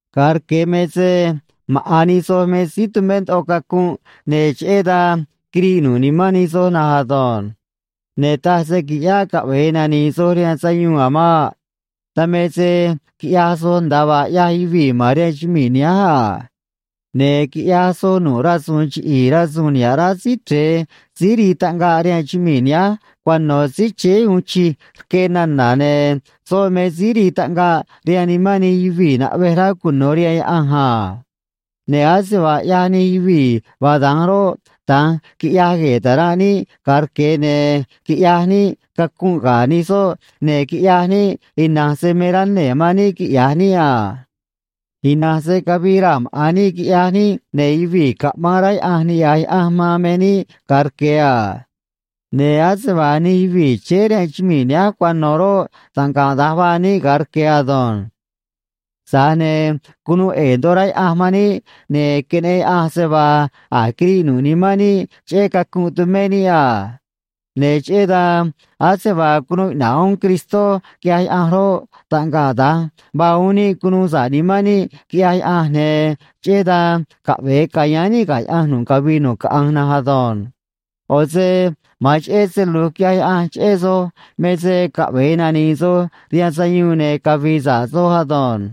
Ga̱a rque̱ me se maꞌa̱n nij soj me síí tumé ndoꞌo cacunꞌ, ne̱ cheꞌé dan quiriꞌ nu̱ꞌ nimán nij soj na̱nj ado̱nj. Ne̱ taj se quiꞌyáꞌ caꞌve̱e nani̱i̱ soj rihaan sayuun a̱ maꞌ. Dan me se quiꞌyaj soj nda̱a vaa ꞌyaj yuvii̱ ma̱n rihaan chumii̱ nihánj a. Ne̱ quiꞌyaj soj nu̱ꞌ rasu̱u̱n chiꞌi̱i̱ rasu̱u̱n niha̱ꞌ rá Síí Chre̱e síí rii taꞌngaꞌ rihaan chumii̱ nihánj cuano̱ síí chéé uun chij rque nana̱, ne̱ soꞌ me síí rii taꞌngaꞌ rihaan nimán nij yuvii̱ naꞌvej rá cuno̱ rihaan Yaꞌanj a. Ne̱ ase vaa ꞌyaj nij yuvii̱ vaa da̱nj roꞌ, da̱nj quiꞌyaj gue̱e̱ ta̱ranꞌ níꞌ ga̱a rque̱, ne̱ quiꞌyaj níꞌ cacunꞌ ga̱ nij soꞌ, ne̱ quiꞌyaj níꞌ ina̱nj se me rá nee̱ man níꞌ quiꞌya̱j níꞌ a. Ina̱nj se cavii raa̱ maꞌa̱n níꞌ quiꞌyaj níꞌ, ne̱ yuvii̱ caꞌmaan rá Yaꞌanj niꞌya̱j Yaꞌanj man me níꞌ ga̱a rque̱ a. Ne̱ ase vaa nij yuvii̱ chéé rihaan chumii̱ nihánj cuano̱ roꞌ, taꞌngaꞌ da̱nj vaa níꞌ ga̱a rque̱ ado̱nj. Tza̱j ne̱ cunuu ꞌe̱e̱ ndoꞌo rá Yaꞌanj man níꞌ, ne̱ queneꞌen Yaꞌanj se vaa a̱j quiriꞌ nu̱ꞌ nimán níꞌ cheꞌé cacunꞌ tumé níꞌ a. Ne̱ cheꞌé dan, ase vaa cunuu iꞌna̱ꞌ uún Cristó quiꞌyaj Yaꞌanj roꞌ, taꞌngaꞌ da̱nj vaa uún níꞌ cunuu sa̱ꞌ nimán níꞌ, quiꞌyaj Yaꞌanj, ne̱ cheꞌé dan caꞌve̱e ca̱yáán níꞌ ga̱ Yaꞌanj nu̱ꞌ cavii nu̱ꞌ caꞌanj na̱nj ado̱nj. ꞌO̱ se ma̱an cheꞌé se lu̱j quiꞌyaj Yaꞌanj cheꞌé soj me se caꞌve̱e nani̱i̱ soj rihaan sayuun ne̱ cavi̱i̱ sa̱ꞌ soj ado̱nj.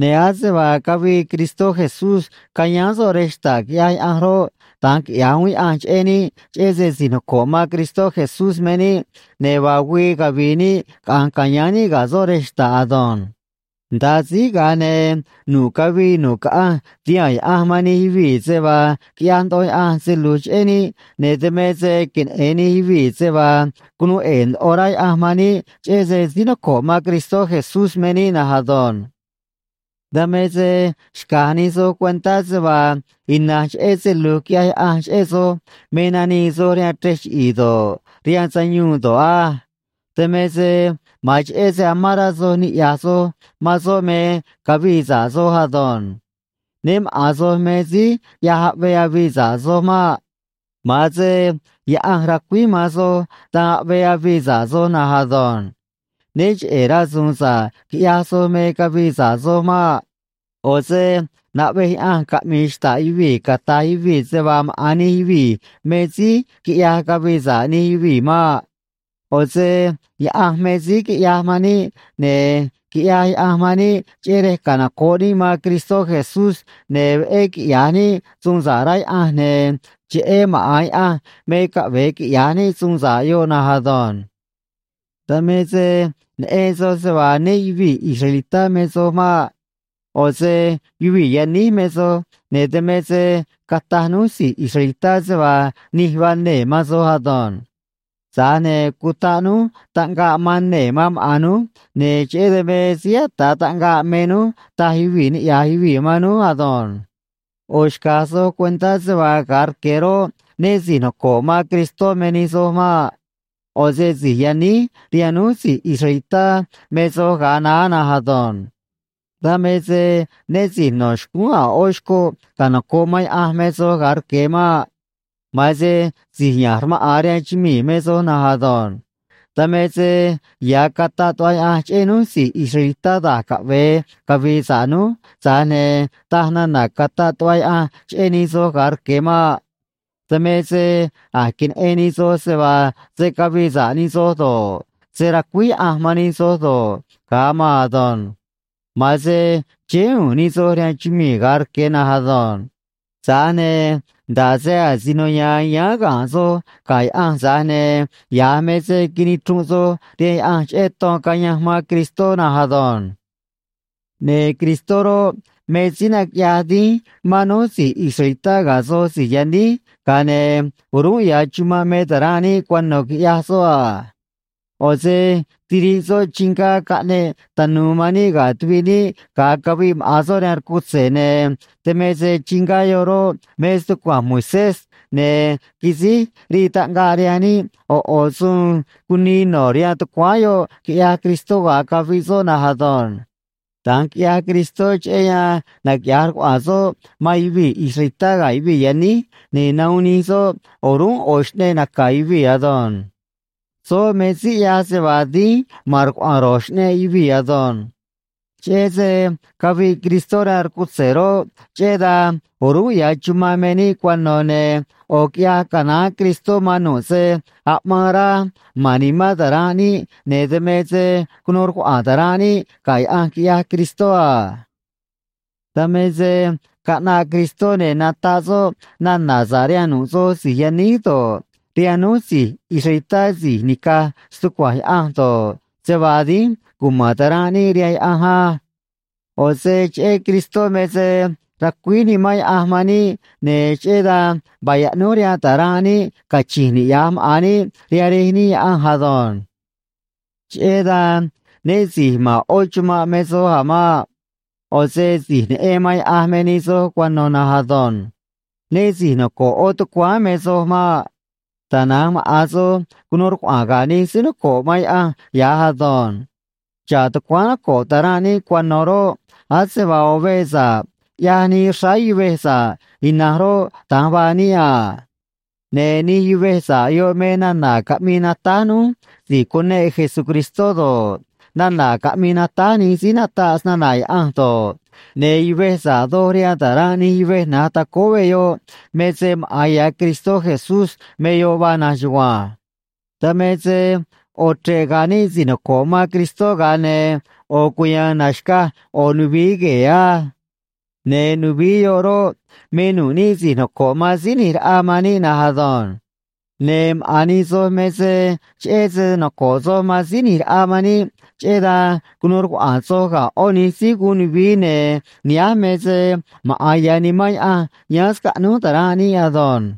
Ne̱ ase vaa cavii Cristó Jesús cayáán soꞌ rej xta̱ꞌ quiꞌyaj Yaꞌanj roꞌ, da̱nj quiꞌyaj uún Yaꞌanj cheꞌé níꞌ, cheꞌé se si̱j noco̱ꞌ man Cristó Jesús me níꞌ, ne̱ vaa güii cavi̱i̱ níꞌ caꞌa̱nj ca̱yáán níꞌ ga̱ soꞌ rej xta̱ꞌ ado̱nj. Nda̱a síj, ga̱a ne̱ nu̱ꞌ cavii nu̱ꞌ caꞌanj ti̱haa̱n Yaꞌanj man nij yuvii̱ se vaa quiꞌyaj ndoꞌo Yaꞌanj se lu̱j cheꞌé níꞌ, ne̱ dan me se queneꞌe̱n nij yuvii̱ se vaa cunuu ꞌe̱e̱ ndoꞌo rá Yaꞌanj man níꞌ cheꞌé se síí noco̱ꞌ man Cristó Jesús me níꞌ na̱nj ado̱nj. Dan me se xca̱j nij soj cuentá se vaa ina̱nj cheꞌé se lu̱j quiꞌyaj Yaꞌanj cheꞌé soj me nanii soj rihaan chrej chiꞌi̱i̱ do̱ꞌ, rihaan sayuun do̱ꞌ á. Dan me se ma̱an cheꞌé se amán rá soj niꞌya̱j soj man soꞌ me cavii sa̱ꞌ soj ado̱nj. Né maꞌa̱n soj me síí ꞌyaj aꞌvee avii sa̱ꞌ soj maꞌ. Ma̱an se Yaꞌanj racuíj man soj dan aꞌvee avii sa̱ꞌ soj na̱nj ado̱nj. Né cheꞌe̱ rasu̱u̱n sa̱ꞌ quiꞌyaj soj me cavii sa̱ꞌ soj maꞌ. ꞌO̱ se naꞌvej Yaꞌanj caꞌmi̱i̱ xta̱ꞌ yuvii̱ cata̱j yuvii̱ se vaa maꞌa̱n nij yuvii̱ me síí quiꞌyaj cavii sa̱ꞌ nij yuvii̱ maꞌ. ꞌO̱ se Yaꞌanj me síí quiꞌyaj man níꞌ, ne̱ quiꞌyaj Yaꞌanj man níꞌ cheꞌé rej canoco̱ꞌ níꞌ man Cristó Jesús ne̱ veꞌé quiꞌya̱j níꞌ suun sa̱ꞌ, rá Yaꞌanj, ne̱ cheꞌé maꞌa̱n Yaꞌanj me caꞌve̱e quiꞌya̱j níꞌ suun sa̱ꞌ yoꞌ na̱nj ado̱nj. Dan me se neꞌen soj se vaa né yuvi̱i̱ israelitá me soj maꞌ. ꞌO̱ se yuvii̱ yaníj me soj, ne̱ dan me se cataj núj si̱j israelitá se vaa nij vaa nee̱ man soj ado̱nj. Tza̱j ne̱ cutaꞌ núj taꞌngaꞌ man nee̱ man maꞌa̱n núj, ne̱ cheꞌé dan me síí ata̱ꞌ taꞌngaꞌ me núj, taj yuvii̱ niꞌya̱j yuvii̱ man núj ado̱nj. ꞌO̱ xca̱j soj cuentá se vaa ga̱a rque̱ roꞌ, né si̱j noco̱ꞌ man Cristó me nij soj maꞌ. ꞌO̱ se si̱j yaníj rihaan núj si̱j israelitá me soj ga̱a naá na̱nj ado̱nj. Dan me se né si̱j no̱ xcúún a̱ ꞌó xcoꞌ canoco̱ꞌ man Yaꞌanj me soj ga̱a rque̱ maꞌ. Ma̱an se si̱j ya̱nj rmaꞌa̱n rihaan chumii̱ me soj na̱nj ado̱nj. Dan me se ya̱ cataꞌ tuꞌva Yaꞌanj cheꞌé núj si̱j israelitá da̱j caꞌve̱e cavi̱i̱ sa̱ꞌ núj, tza̱j ne̱ taj nana̱ cataꞌ tuꞌva Yaꞌanj cheꞌé nij soj ga̱a rque̱ maꞌ. Dan me se a̱j queneꞌen nij soj se vaa se̱ cavii sa̱ꞌ nij soj do̱ꞌ, se̱ racuíj Yaꞌanj man nij soj do̱ꞌ, ga̱a maan ado̱nj. Ma̱an se chéé u̱u̱n nij soj rihaan chumii̱ ga̱a rque̱ na̱nj ado̱nj. Tza̱j ne̱ nda̱ꞌ se asino ya̱a̱n yáán ga̱nꞌ soj ga̱ Yaꞌanj, tza̱j ne̱ ya̱j me se quinichrunꞌ soj rihaan Yaꞌanj cheꞌé ton cayanj man Cristó na̱nj ado̱nj. Ne̱ Cristó roꞌ, me síí naquiꞌyaj dínj man núj si̱j israelitá ga̱ soj si̱j yaníj, ga̱a ne̱ o̱rúnꞌ ya̱ chumanꞌ me ta̱ranꞌ níꞌ cuano̱, quiꞌyaj soꞌ a. ꞌO̱ se tiriꞌ soꞌ chingá caꞌneꞌ tanu̱u̱ man níꞌ ga̱ tuviꞌ níꞌ, ga̱a caviꞌ maꞌa̱n soꞌ rihaan rcutze̱, ne̱ dan me se chingá yoꞌ roꞌ, me stucua̱nj Moisés, ne̱ quisíj rii taꞌngaꞌ rihaan níꞌ ꞌo̱ ꞌo̱ suun cunii no̱ rihaan tucuáán yoꞌ, quiꞌyaj Cristó ga̱a caviꞌ soꞌ na̱nj ado̱nj. Da̱nj quiꞌyaj Cristó cheꞌé yan naquiꞌya̱j rcuaꞌa̱a̱n soꞌ man yuvii̱ israelitá ga̱ yuvii̱ yaníj, ne̱ nahuun nij soꞌ o̱rúnꞌ ꞌo̱ xꞌneꞌ naca̱ yuvii̱ ado̱nj. Soꞌ me síí ꞌyaj se vaa dínj ma̱n rcuaꞌa̱a̱n ro̱j xꞌneꞌ yuvii̱ ado̱nj. Cheꞌé se caviꞌ Cristó rihaan rcutze̱ roꞌ, cheꞌé dan o̱rúnꞌ ya̱ chumanꞌ me níꞌ cuano̱, ne̱ ꞌo̱ quiꞌyaj canaán Cristó man nu̱ꞌ se aꞌmaan rá ma̱n nimán ta̱ranꞌ níꞌ, ne̱ dan me se cunuu rcuaꞌa̱a̱n ta̱ranꞌ níꞌ ga̱ Yaꞌanj, quiꞌyaj Cristó a. Dan me se caꞌnaꞌ Cristó, ne̱ nataꞌ soꞌ nana̱ sa̱ꞌ rihaan nu̱ꞌ soj si̱j yaníj do̱ꞌ, rihaan núj si̱j israelitá si̱j nica̱j stucua̱nj Yaꞌanj do̱ꞌ, se vaa dínj cuma̱n ta̱ranꞌ níꞌ rihaan Yaꞌanj á. ꞌO̱ se cheꞌé Cristó me se racuíj Nimán Yaꞌanj man níꞌ, ne̱ cheꞌé dan vaa yaꞌnúj rihaan ta̱ranꞌ níꞌ cachi̱nj niꞌya̱j maꞌa̱n níꞌ rihaan Rej níꞌ Yaꞌanj ado̱nj. Cheꞌé dan né si̱j ma̱n ꞌó chumanꞌ me soj a̱ maꞌ. ꞌO̱ se si̱j neꞌen man Yaꞌanj me nij soj cuano̱ na̱nj ado̱nj. Né si̱j noco̱ꞌ ꞌó tucuáán me soj maꞌ. Tana̱nj maꞌa̱n soj cunuu rcuaꞌa̱a̱n ga̱ nij síí noco̱ꞌ man Yaꞌanj ya̱j ado̱nj. Xa̱ꞌ tucuáán noco̱ꞌ ta̱ranꞌ níꞌ cuano̱ roꞌ, ase vaa ꞌo̱ veꞌ sa̱ꞌ ꞌyaj nii xráá yuvej sa̱ꞌ ina̱nj roꞌ, da̱nj vaa níꞌ a. Ne̱ nij yuvej sa̱ꞌ yoꞌ me nana̱ caꞌmii natáj núj si̱j cuneꞌ Jesucristó do̱ꞌ, nana̱ caꞌmii natáj nij síí nataꞌ snana̱ Yaꞌanj do̱ꞌ, ne̱ yuvej sa̱ꞌ doj rihaan ta̱ranꞌ nij yuvej na̱j tacóó veꞌ yoꞌ me se maꞌa̱n ya̱ Cristó Jesús me yoꞌ vaa na̱nj chugua̱nj. Dan me se ꞌo̱ chre̱ꞌ ga̱a̱ níꞌ si̱j noco̱ꞌ man Cristó, ga̱a ne̱ ꞌo̱ cuya̱a̱n na̱xcaj ꞌo̱ nuvií gue̱e̱ á. Ne̱ nuvií yoꞌ roꞌ, me nu̱ꞌ níꞌ si̱j noco̱ꞌ man Síí ꞌNi̱j Raꞌa man níꞌ na̱nj ado̱nj. Ne̱ maꞌa̱n nij soj me se cheꞌé se noco̱ꞌ soj man Síí ꞌNi̱j Raꞌa man níꞌ, cheꞌé dan cunuu rcuaꞌa̱a̱n soj ga̱ ꞌó nij síí guun nuvií, ne̱ nihánj me se maꞌa̱n ya̱ Nimán Yaꞌanj yáán scaꞌnúj ta̱ranꞌ níꞌ ado̱nj.